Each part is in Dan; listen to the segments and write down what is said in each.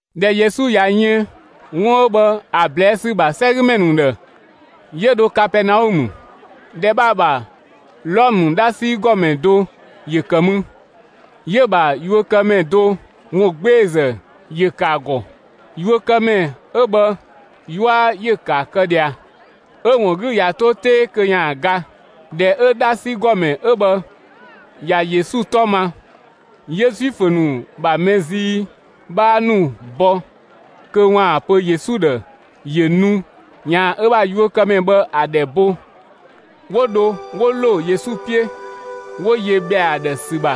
꞊Dhɛ Yesu ꞊ya yën 'wun 'ö bhë ‑a ꞊blɛɛ' ‑sü ‑bha 'sɛgümɛ ‑nu ‑dhë, 'yö dho Kapɛɛnaɔmë. ‑Dhɛ bhë ‑a ‑bha, Wlɔmë 'dhasi ‑gɔmɛ do ‑yö ‑kë mü, 'yö‑ ‑bha yuökëmɛ do ‑wungbeezë ‑yö ‑kë ‑a ‑gɔ. Yuökëmɛ 'ö bhë 'yua ‑yö ‑kë ‑a kë ꞊dhia, 'ö‑ ‑wun 'gü ꞊ya 'to 'tee kö ‑yaan ga. ꞊Dhɛ 'ö 'dhasi ‑gɔmɛ 'ö bhë ꞊ya Yesu 'tɔ ma, 'yö Zuifö ‑nu ‑bha mɛ zii 'bhaa ‑nu bɔ kö ‑waan pö Yesu ‑dhë ‑yö nu ‑yaan ö bha yuökëmɛ bhë ‑a ‑dhɛ bo. 'Wo dho 'wo ‑lo Yesu 'piö, 'wo yö ‑bhɛa ‑a ‑dhë ‑sü ‑bha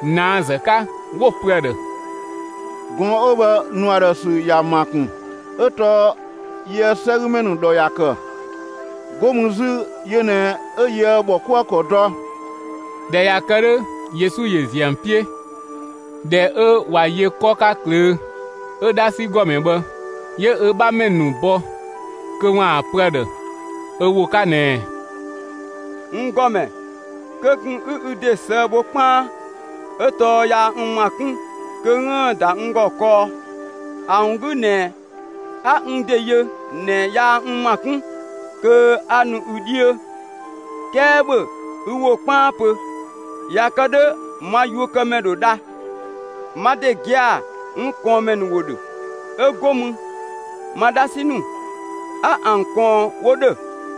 ꞊naazë 'ka, 'wo‑ pö ‑a ‑dhë: «Gɔɔn‑ 'ö bhë, ‑nu ‑a ‑dhë ‑sü ‑ya ‑ma ‑kun, 'ö tɔɔ yië‑ 'sɛgümɛ ‑nu ‑dhɔ ‑ya ‑kë, 'go mü 'zü yö ꞊nɛ 'yö yië‑ ‑bhɔkuëkɔ dɔ.» ꞊Dhɛ ꞊ya kë 'dhö, Yesu ‑yö ‑ziö ‑an 'piö. ꞊Dhɛ 'ö ꞊wa yö 'kɔ 'ka ꞊klöö', 'ö 'dhasi ‑gɔmɛ bhë 'yö ö 'bhamɛ ‑nu bɔ kö ‑waan pö ‑a ‑dhë ö ‑wo 'ka ꞊nɛɛ: «N ‑Gɔmɛ, kö ꞊kun 'ü ü ‑de ꞊sëë' bho 'kpaan, 'ö tɔɔ yaa n ‑ma 'kun kö 'üën‑ ‑da n ‑gɔ kɔɔ. ‑A ‑wun 'gü ꞊nɛ 'a n ‑de yö ꞊nɛ yaa n ‑ma 'kun kö 'a nu ü 'dhiö, 'kɛɛ ‑bhö ü ‑wo 'kpaan pö, ꞊ya kë 'dhö ma yuökëmɛ ‑dho dha. Ma ‑de gia‑ n ꞊kɔɔnmɛ ‑nu ‑wo ‑dhö, 'ö go mü ma 'dhasi ‑nu 'a ‑an ꞊kɔɔn 'wo ‑dhö.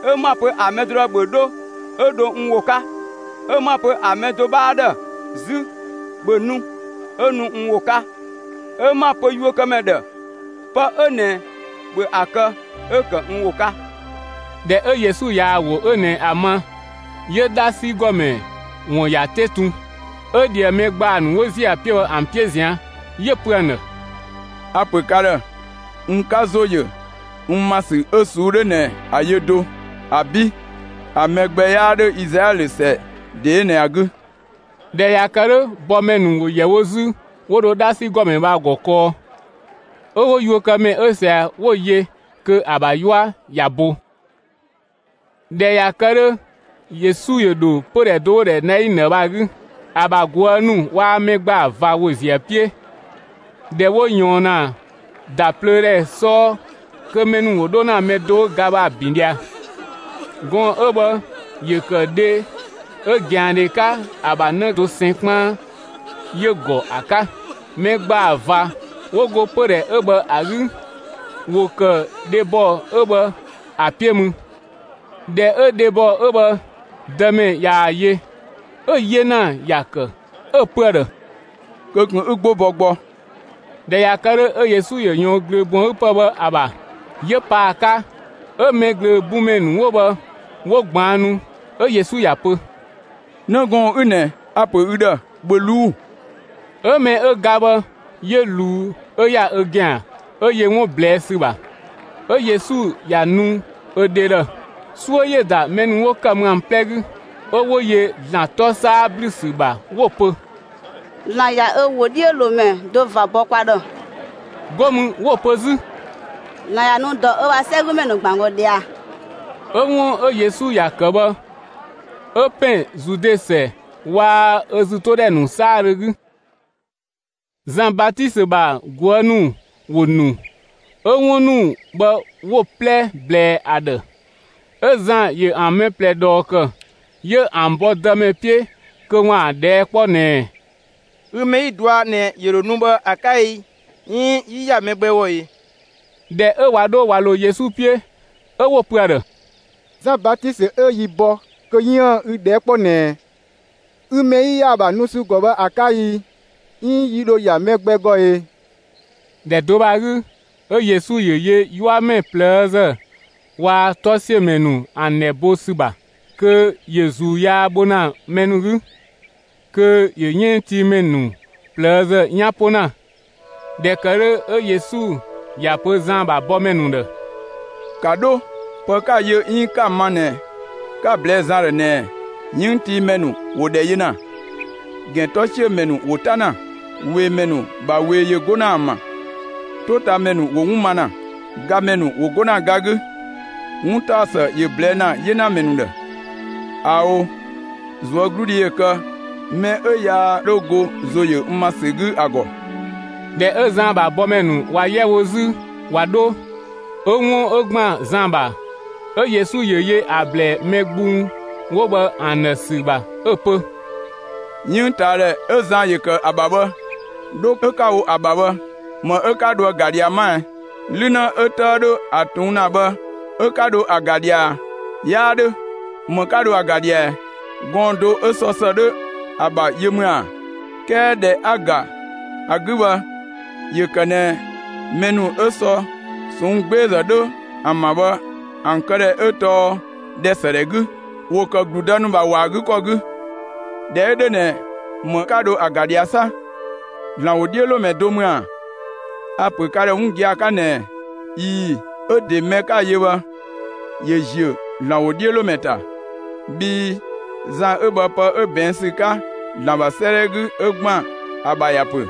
'Ö 'ma‑ pö ‑a mɛ do ‑dhë: ‹‑Bhö 'dho!› 'ö dho n ‑wo 'ka; 'ö 'ma‑ pö ‑a mɛ do 'bhaa ‑dhë 'zü: ‹‑Bhö nu!› 'ö nu n ‑wo 'ka; 'ö 'ma‑ pö yuökëmɛ ‑dhë: ‹Pë 'ö ꞊nɛ, ‑bhö ‑a kë!› 'ö‑ ‑kë n ‑wo 'ka.» ꞊Dhɛ 'ö Yesu ꞊yaa‑ ‑wo 'ö ꞊nɛ ‑a ma, 'yö 'dhasi ‑gɔmɛ ‑wun ‑ya 'te tun, 'ö ꞊dhië mɛ ‑gbaa ‑nu 'wo ‑ziö ‑a 'piö bhë ‑an 'piö ꞊zian', 'yö‑ pö ‑an ‑dhë: «A‑ ‑pö ka ‑dhë n 'ka ‑zo yö n ‑ma ‑sü 'ö ꞊suu'‑ 'dhö ꞊nɛ ‑a yö do, ‑abi', ‑a mɛ gbɛ 'yaa 'dhö Izlaɛlö ‑sɛ ‑de 'ö ꞊nɛ ‑a 'gü!» ꞊Dhɛ ꞊ya kë 'dhö, bɔmɛ ‑nu ‑wo ‑yɛ wo 'zü 'wo dho 'dhasi ‑gɔmɛ bhë ‑a ‑gɔ kɔɔ, 'ö 'wo yuökëmɛ 'ö ꞊sia 'wo‑ yö kö ‑a ‑bha 'yua ꞊ya bo. ꞊Dhɛ ꞊ya kë 'dhö, Yesu ‑yö ‑dho pödhɛ do 'wo‑ ‑dhɛ Nainë bhë ‑a 'gü. ‑A ‑bha ꞊guë' ‑nu waa‑ mɛ ‑gbaa ꞊va ‑wo ‑ziö ‑a 'piö. ꞊Dhɛ 'wo ꞊yɔɔn ‑na ‑da plöö ‑dhɛ 'sɔɔ kö mɛ ‑nu ‑wo 'dho ‑na mɛ do 'ö ga bhë ‑a ‑bin ꞊dhia. Gɔɔn‑ 'ö bhë ‑yö ‑kë dhe 'ö ꞊gɛandhe 'ka ‑a ‑bha 'në dosɛn 'kpaan 'yö‑ ‑gɔ ‑a 'ka. Mɛ ‑gbaa ꞊va 'wo go pödhɛ 'ö bhë ‑a 'gü, ‑wo ‑kë dhebɔ 'ö bhë ‑a 'piö mü. ꞊Dhɛ 'ö dhebɔ 'ö bhë Dëmɛ ꞊yaa‑ yö, 'ö‑ 'yena ‑ya ‑kë 'ö‑ pö ‑a ‑dhë: «Kö ꞊kun 'ü 'gbo bɔ gbɔ!» ꞊Dhɛ ꞊ya kë 'dhö, 'ö Yesu ‑yö ꞊yɔɔn ꞊glöö ‑bun ‑a 'gü ‑pë bhë ‑a ‑bha 'yö pa ‑a 'ka 'ö mɛ ꞊glöö bun ‑mɛ ‑nu 'wo bhë 'wo ꞊gbaannu, 'ö Yesu ‑ya pö: «'Në gɔɔn‑ 'ü ꞊nɛ, a‑ ‑pö ü ‑dhë, ‑bhö ꞊luu'‑!» 'Ö mɛ 'ö ga bhë 'yö ꞊luu 'ö ‑ya ö ‑gɛan 'ö yö 'wun ꞊blɛɛ' ‑sü ‑bha, 'ö Yesu ‑ya nu ö dhe ‑dhë. 'Suö ‑yö ‑da mɛ ‑nu 'wo ‑kë mü ‑an 'plɛ 'gü, 'ö 'wo yö ‑Zlan 'tɔ 'saa ‑blü ‑sü ‑bha 'wo‑ pö: «‑Zlan ꞊ya ö ‑wodhiölomɛ do ꞊va bɔ kwa ‑dhë!» 'Go mü 'wo‑ pö 'zü: «‑Zlan ꞊ya nu ‑dɔ ö bha 'sɛgümɛ ‑nu ‑gban ‑gɔ ꞊dhia!» 'Ö 'wun 'ö Yesu ‑ya ‑kë bhë 'ö ‑pɛn Zude ‑sɛ waa‑ ‑a ‑zütodhɛ ‑nu 'saadhö 'gü. Zan Batisö ‑bha ꞊guë' ‑nu ‑wo ‑nu, 'ö 'wun ‑nu bhë 'wo‑ 'plɛ ꞊blɛɛ ‑a ‑dhë. 'Ö Zan ‑yö ‑an mɛ ꞊plɛ ꞊dhɔɔ ‑kë, 'yö ‑an bɔ Dëmɛ 'piö kö ‑waan ‑a ꞊dhɛɛ' 'kpɔ ꞊nɛɛ: «Ü mɛ 'yi‑ dɔa ꞊nɛ ‑yö ‑dho nu bhë ‑a 'ka i, 'iin 'yi ‑ya mɛ gbɛ ‑gɔ e?» ꞊Dhɛ 'ö ꞊wa 'dho ꞊wa ‑lo Yesu 'piö, 'ö 'wo‑ pö ‑a ‑dhë: «Zan Batisö 'ö yi bɔ kö 'yiën‑ ü ꞊dhɛɛ' 'kpɔ ꞊nɛɛ ü mɛ 'yi ‑ya ‑a ‑bha nu ‑sü ‑gɔ bhë ‑a 'ka i, 'iin yi ‑dho ‑ya mɛ gbɛ ‑gɔ e?» ‑Dhɛ do bhë ‑a 'gü, 'ö Yesu ‑yö yö 'yuamɛ ꞊plëëzë waa‑ 'tɔsiömɛ ‑nu ‑an ‑dhɛ bo ‑sü ‑bha, kö ‑yö ‑zuu yaa bho ‑na mɛ ‑nu 'gü, kö ‑yö 'yënngtiimɛ ‑nu ꞊plëëzë 'yan 'po ‑na. ꞊Dhɛ ‑kë 'dhö 'ö Yesu ‑ya pö Zan ‑bha bɔmɛ ‑nu ‑dhë: «‑Ka 'dho, pë 'ka‑ yö 'iin 'ka‑ ma ꞊nɛ 'ka‑ ꞊blɛɛ Zan ‑dhë ꞊nɛɛ: 'Yënngtiimɛ ‑nu ‑wo ‑dhɛ yö ‑na, ‑gɛntɔsiömɛ ‑nu ‑wo 'ta ‑na, ꞊weemɛ ‑nu ‑bha ꞊wee ‑yö 'go ‑na ‑an ‑bha, 'totamɛ ‑nu ‑wo 'wun ma ‑na, gamɛ ‑nu ‑wo 'go ‑na ga 'gü, 'wuntaɔsë ‑yö ꞊blɛɛ' ‑na 'yenamɛ ‑nu ‑dhë. ꞊Ao'! ꞊Zuögludhi ‑yö kë mɛ 'ö yaa 'dho go ‑zo ‑yö n ‑ma ‑sü 'gü ‑a ‑gɔ!» ꞊Dhɛ 'ö Zan ‑bha bɔmɛ ‑nu ꞊wa 'yɛ wo 'zü ꞊wa 'dho, 'ö 'wun 'ö ‑gban Zan ‑bha, 'ö Yesu ‑yö yö ‑a ‑blɛɛ mɛ gbung 'wo bhë ‑an ‑dhë ‑sü ‑bha 'ö‑ pö: «'Yënngtaadhɛ 'ö Zan ‑yö ‑kë ‑a ‑bha bhë, 'dho 'ö 'ka‑ wo ‑a ‑bha bhë, ‑më 'ö 'ka dho ‑a ‑ga ꞊dhia 'ma ɛ? 'Lü 'në 'ö 'tëë 'dho ‑a ꞊tuun' ‑na bhë 'ö 'ka dho ‑a ‑ga ꞊dhia ꞊a? 'Yaa 'dhö, ‑më 'ka dho ‑a ‑ga ꞊dhia ꞊ɛ? Gɔɔn‑ do 'ö sɔ ‑së 'dho ‑a ‑bha yö ‑mü ‑a? 'Kɛɛ ꞊dhɛ 'a ‑ga ‑a 'gü bhë, ‑yö ‑kë ꞊nɛ mɛ ‑nu 'ö sɔ ꞊sɔnng' 'gbeezë 'dho ‑an ‑bha bhë, ‑an këdhɛ 'ö tɔɔ ‑dhɛ ‑së ‑dhɛ 'gü, ‑wo ‑kë ‑gludë ‑nu ‑bha wɔ ‑a 'gü ‑kɔ 'gü. ꞊Dhɛ 'ö 'dhö ꞊nɛ, ‑më 'ka dho ‑a ‑ga ꞊dhia 'sa? ‑Zlan ‑wodhiölomɛ do ‑mü ‑a? A‑ ‑pö ka ‑dhë 'wun gia‑ 'ka ꞊nɛɛ: ꞊Ii‑, 'ö ‑de, mɛ 'ka‑ yö bhë, ‑yö ‑ziö ‑Zlan ‑wodhiölomɛ ‑ta, bhii Zan 'ö bhë pë 'ö ꞊bɛɛn' ‑sü 'ka ‑Zlan ‑bha 'sëëdhɛ 'gü 'ö ‑gban ‑a ‑bha ‑ya ‑pö: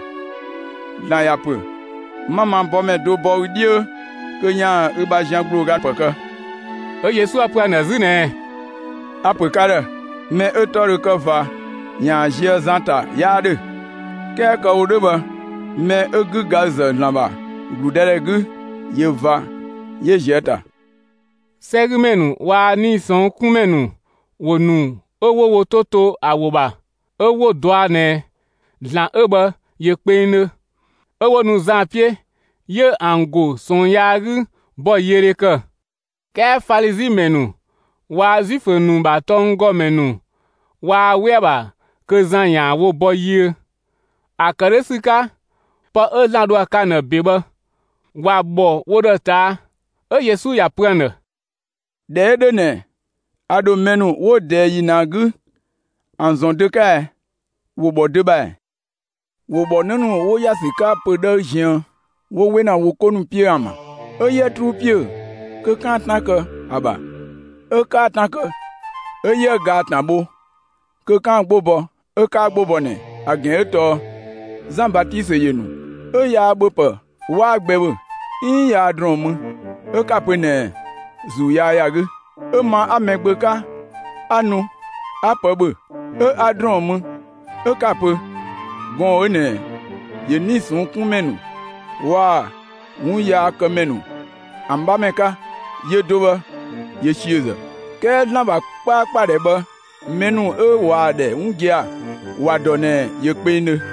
‑Zlan ‑ya ‑pö: 'Ma ma bɔmɛ do bɔ ü 'dhiö, kö ‑yaan ü bha zian ‑gblooga ‑pë kë.» 'Ö Yesu ‑ya pö ‑an ‑dhë 'zü ꞊nɛɛ: «A‑ ‑pö ka ‑dhë: Mɛ 'ö‑ 'tɔ dho kë ꞊va ‑yaan ꞊zië' Zan ‑ta 'yaa 'dhö, 'kɛɛ kë‑ wo 'dhö bhë, mɛ 'ö 'gügaazë ‑Zlan ‑bha ‑gludëdhɛ 'gü, ꞊yö ꞊va 'yö ꞊zië' ‑a ‑ta.» 'Sɛgümɛ ‑nu waa‑ 'nii‑ ꞊sɔnng' 'kun ‑mɛ ‑nu ‑wo ‑nu, 'ö 'wo wo 'to to ‑a ‑wo ‑bha; 'ö 'wo‑ dɔa ꞊nɛ ‑Zlan 'ö bhë ‑yö kpengdhö, 'ö 'wo nu Zan 'piö, 'yö ‑an ‑go ꞊sɔɔn yaa 'gü ‑bɔyiödhe ‑kë. 'Kɛɛ Falizi ‑mɛ ‑nu waa‑ Zuifö ‑nu ‑bha tɔnggɔmɛ ‑nu waa 'we ‑a ‑bha kö Zan ‑yaan wo bɔ yiö. ‑A ‑kë 'dhö ‑sü 'ka, pë 'ö ‑Zlan dho ‑a kë ‑an ‑dhë ‑be bhë, ‑wa ‑bhɔ wo ‑dhë ꞊taa'. 'Ö Yesu ‑ya pö ‑an ‑dhë: «꞊Dhɛ 'ö 'dhö ꞊nɛ, a ‑dho mɛ ‑nu 'wo ꞊dɛɛ ‑yi ꞊nɛ ‑a 'gü, ‑an ‑zɔn dö 'ka ɛ? ‑Wo ‑bhɔ dö ‑bha ‑ɛ? ‑Wo ‑bhɔ 'në ‑nu 'wo ‑ya ‑sü 'ka pö‑ 'dhëë ziën 'wo 'we ‑na wo 'ko ‑nu 'piö ‑an ‑bha: ‹'Ö 'yië 'truu 'piö kö 'kaan‑ 'tan kë ‑a ‑bha 'ö 'kaa 'tan kë! 'Ö 'yië gaa‑ ‑tan bho kö 'kaan‑ 'gbo bɔ 'ö 'kaa 'gbo bɔ ꞊nɛ!› ‑A ‑gɛn 'ö tɔɔ: Zan Batisö ‑yö ‑nu, 'ö 'yaa ‑bhöpë 'waa gbɛ ‑bhö, 'iin 'yaa ‑drɔɔn mü, 'ö 'ka‑ pö ꞊nɛɛ: ‹‑Zuu yaa ‑ya 'gü!› 'Ö ma 'a Mɛgbö 'ka, 'a nu 'a pë ‑bhö 'ö 'a ‑drɔɔn mü 'ö 'ka‑ pö: ‹Gɔɔn‑ 'ö ꞊nɛ ‑yö 'nii‑ ꞊sɔnng' 'kun ‑mɛ ‑nu waa‑ 'wunyaakëmɛ ‑nu ‑an 'bhamɛ 'ka; yö do bhë ꞊yö ‑siözë!› 'Kɛɛ ‑Zlan ‑bha 'kpaakpadhɛ bhë mɛ ‑nu 'ö ꞊waa‑ ‑dhɛ 'wun gia‑ ‑wa dɔ ꞊nɛ ‑yö kpengdhö.»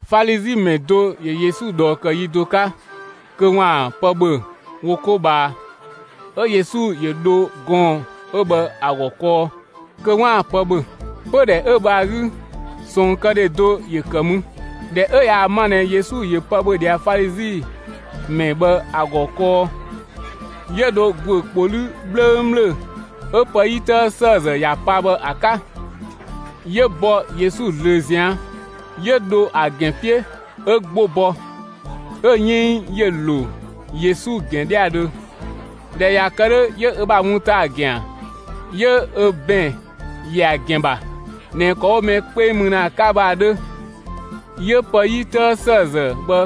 Falizi ‑mɛ do ‑yö Yesu ꞊dhɔɔ ‑kë yi do 'ka kö 'waan‑ pë ‑bhö wo 'ko ꞊bhaa, 'ö Yesu ‑yö dho gɔɔn‑ 'ö bhë ‑a ‑gɔ kɔɔ kö 'waan‑ pë ‑bhö. Pödhɛ 'ö bhë ‑a 'gü ꞊sɔɔnkëdhe do ‑yö ‑kë mü. ꞊Dhɛ 'ö ꞊yaa‑ ma ꞊nɛ Yesu ‑yö pë ‑bhö ꞊dhia Falizi ‑mɛ bhë ‑a ‑gɔ kɔɔ, 'yö dho ‑guö ‑kpo 'lü 'bhlöngbhlöng 'ö pë 'yi 'tëë ‑sëëzë ‑ya pa bhë ‑a 'ka, 'yö bɔ Yesu ꞊zlöö ꞊zian' 'yö dho ‑a ‑gɛn 'piö 'ö 'gbo bɔ, 'ö‑ 'yënng ‑yö ‑lo Yesu ‑gɛn 'dhɛadhö. ꞊Dhɛ ꞊ya kë 'dhö, 'yö ö bha wun ‑ta ‑a ‑gɛan 'yö ö ‑bɛn ‑yɛ ‑a ‑gɛn ‑bha ꞊nɛ ‑kɔ 'wo mɛ 'kpeng mü ‑na ‑a 'ka bhë ‑a 'dhö, 'yö pë 'yi 'tëë ‑sëëzë bhë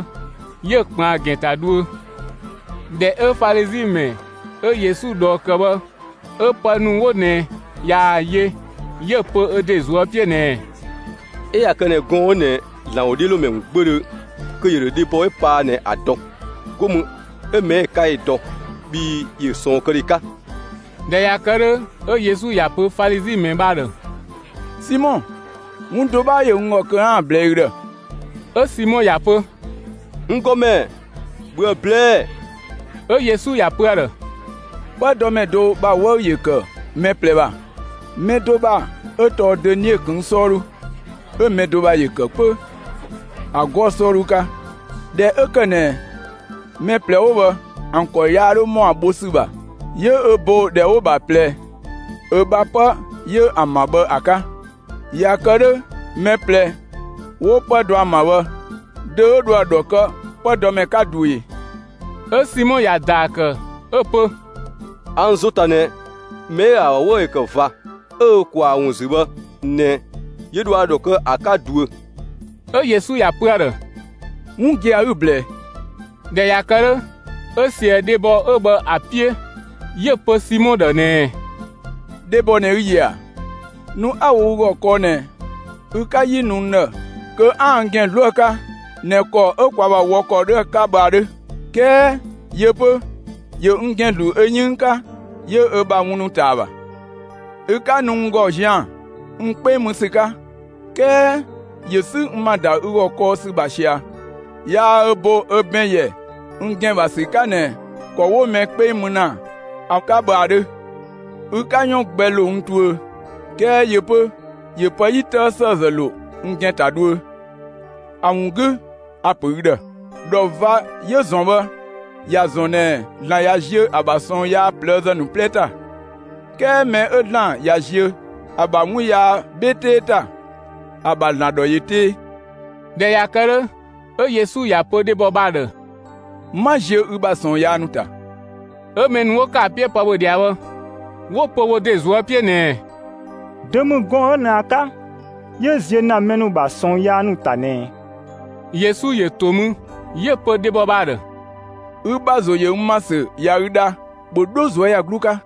'yö‑ ꞊kpënng ‑a ‑gɛn ‑ta dhuö. ꞊Dhɛ 'ö Falizi ‑mɛ 'ö Yesu ꞊dhɔɔ ‑kë bhë 'ö pë ‑nu 'wo ꞊nɛ ꞊yaa‑ yö, 'yö‑ pö ö ‑de ꞊zuö' 'piö ꞊nɛɛ: «'Ö ꞊ya kë ꞊nɛ gɔɔn‑ 'ö ꞊nɛ ‑Zlan ‑wodhiölomɛ ‑mü 'gbödhö, kö ‑yö ‑dho dhebɔ 'yö paa ꞊nɛ ‑a dɔ, 'go mü 'ö mɛ 'ö‑ 'ka 'yö‑ dɔ, bhii ‑yö ꞊sɔɔnkëdhe 'ka.» ꞊Dhɛ ꞊ya kë 'dhö, 'ö Yesu ‑ya pö Falizi ‑mɛ bhë ‑a ‑dhë: «Simɔ, 'wun do 'bhaa ‑yö n ‑gɔ kö 'aan‑ ꞊blɛɛ'‑ ü ‑dhë.» 'Ö Simɔ ‑ya pö: «N ‑Gɔmɛ, ‑bhöë ꞊blɛɛ'‑!» 'Ö Yesu ‑ya pö ‑a ‑dhë: «'Pëdɔmɛ do ‑bha 'wëü‑ ‑yö ‑kë mɛ ꞊plɛ ‑bha, mɛ do ‑bha 'ö tɔɔ dönie ꞊këng' 'sɔɔdhu, 'ö mɛ do ‑bha ‑yö ‑kë 'pö ‑a 'gɔɔ‑ 'sɔɔdhu 'ka. ꞊Dhɛ 'ö ‑kë ꞊nɛ mɛ ꞊plɛ 'wo bhë ‑an ‑kɔ yaa 'dho ‑mɔ ‑a bho ‑sü ‑bha, 'yö ö bo ‑dhɛ 'wo‑ ‑bha ꞊plɛ ö bha 'pë 'yö ‑an ‑bha bhë ‑a 'ka. ꞊Ya kë 'dhö mɛ ꞊plɛ 'wo 'pë dɔ ‑an ‑bha bhë, dö 'ö dho ‑a ‑dhɔ kë 'pëdɔmɛ 'ka ꞊duö ꞊e?» 'Ö Simɔ ‑ya ‑daa ‑kë 'ö‑ pö: «A n ‑zo ‑ta ꞊nɛ, mɛ 'ö ‑a ‑bha 'wëü‑ ‑yö ‑kë ꞊va, 'ö ö ꞊kwaa ‑a ‑wun ‑zü bhë ꞊nɛ, 'yö dho ‑a ‑dhɔ kë ‑a 'ka ꞊duö.» 'Ö Yesu ‑ya pö ‑a ‑dhë: «'Wun gia‑ 'ü‑ ꞊blɛɛ.» ꞊Dhɛ ꞊ya kë 'dhö, 'ö ꞊sië dhebɔ 'ö bhë ‑a 'piö, 'yö‑ pö Simɔ ‑dhë ꞊nɛɛ: «Dhebɔ ꞊nɛ ü‑ ‑yö ‑a? Nu 'a‑ wo ü ‑gɔ kɔɔ ꞊nɛ, ü 'ka 'yi nu n ‑dhë kö 'aan‑ n ‑gɛn 'zlu ‑a 'ka (꞊nɛ ‑kɔ 'ö kwa ‑bha wɔ ‑kɔ 'dhö ‑a 'ka bhë ‑a 'dhö), 'kɛɛ yö 'pö ‑yö n ‑gɛn ‑zlu ö 'yënng 'ka, 'yö ö bha wun ‑ta ‑a ‑bha. Ü 'ka nu n ‑gɔ zian‑ n 'kpeng mü ‑sü 'ka, 'kɛɛ 'yö sü n ‑ma ‑da ü ‑gɔ kɔɔ ‑sü ‑bha ꞊sia, yaa ö bo ö ‑bɛn ‑yɛ n ‑gɛn ‑bha ‑sü 'ka ꞊nɛ ‑kɔ 'wo mɛ 'kpeng mü ‑na ‑a 'ka bhë ‑a 'dhö; ü 'ka 'yɔn gbɛ ‑lo n tuö, 'kɛɛ yö 'pö ‑yö pë 'yi 'tëë ‑sëëzë ‑lo n ‑gɛn ‑ta dhuö. ‑A ‑wun 'gü 'a‑ pö ü ‑dhë: ‑Dhɔ ꞊va 'yö‑ ‑zɔn bhë ‑ya ‑zɔn ꞊nɛ ‑Zlan ꞊ya ziö ‑a ‑bha ꞊sɔɔn yaa ꞊plëëzë ‑nu 'plɛ ‑ta, 'kɛɛ mɛ 'ö ‑Zlan ꞊ya ziö ‑a ‑bha 'wun yaa 'bhe 'tee ‑ta, ‑a ‑bha ‑Zlan ‑dhɔ ꞊yö 'tee.» ꞊Dhɛ ꞊ya kë 'dhö, 'ö Yesu ‑ya pö dhebɔ bhë ‑a ‑dhë: «'Ma ziö ü bha ꞊sɔɔn yaa ‑nu ‑ta!» 'Ö mɛ ‑nu 'wo ‑kë ‑a 'piö pë ‑bhö ꞊dhia bhë, 'wo‑ pö wo ‑de ꞊zuö' 'piö ꞊nɛɛ: «Dö ‑mü gɔɔn‑ 'ö ꞊nɛ ‑a 'ka 'yö ziö ‑na mɛ ‑nu ‑bha ꞊sɔɔn yaa ‑nu ‑ta ꞊nɛɛ?» Yesu ‑yö ‑to mü 'yö‑ pö dhebɔ bhë ‑a ‑dhë: «Ü ‑bha ‑zo ‑yö n ‑ma ‑sü ꞊ya ü dha, ‑bhö 'dho ꞊zuöyagluu 'ka!»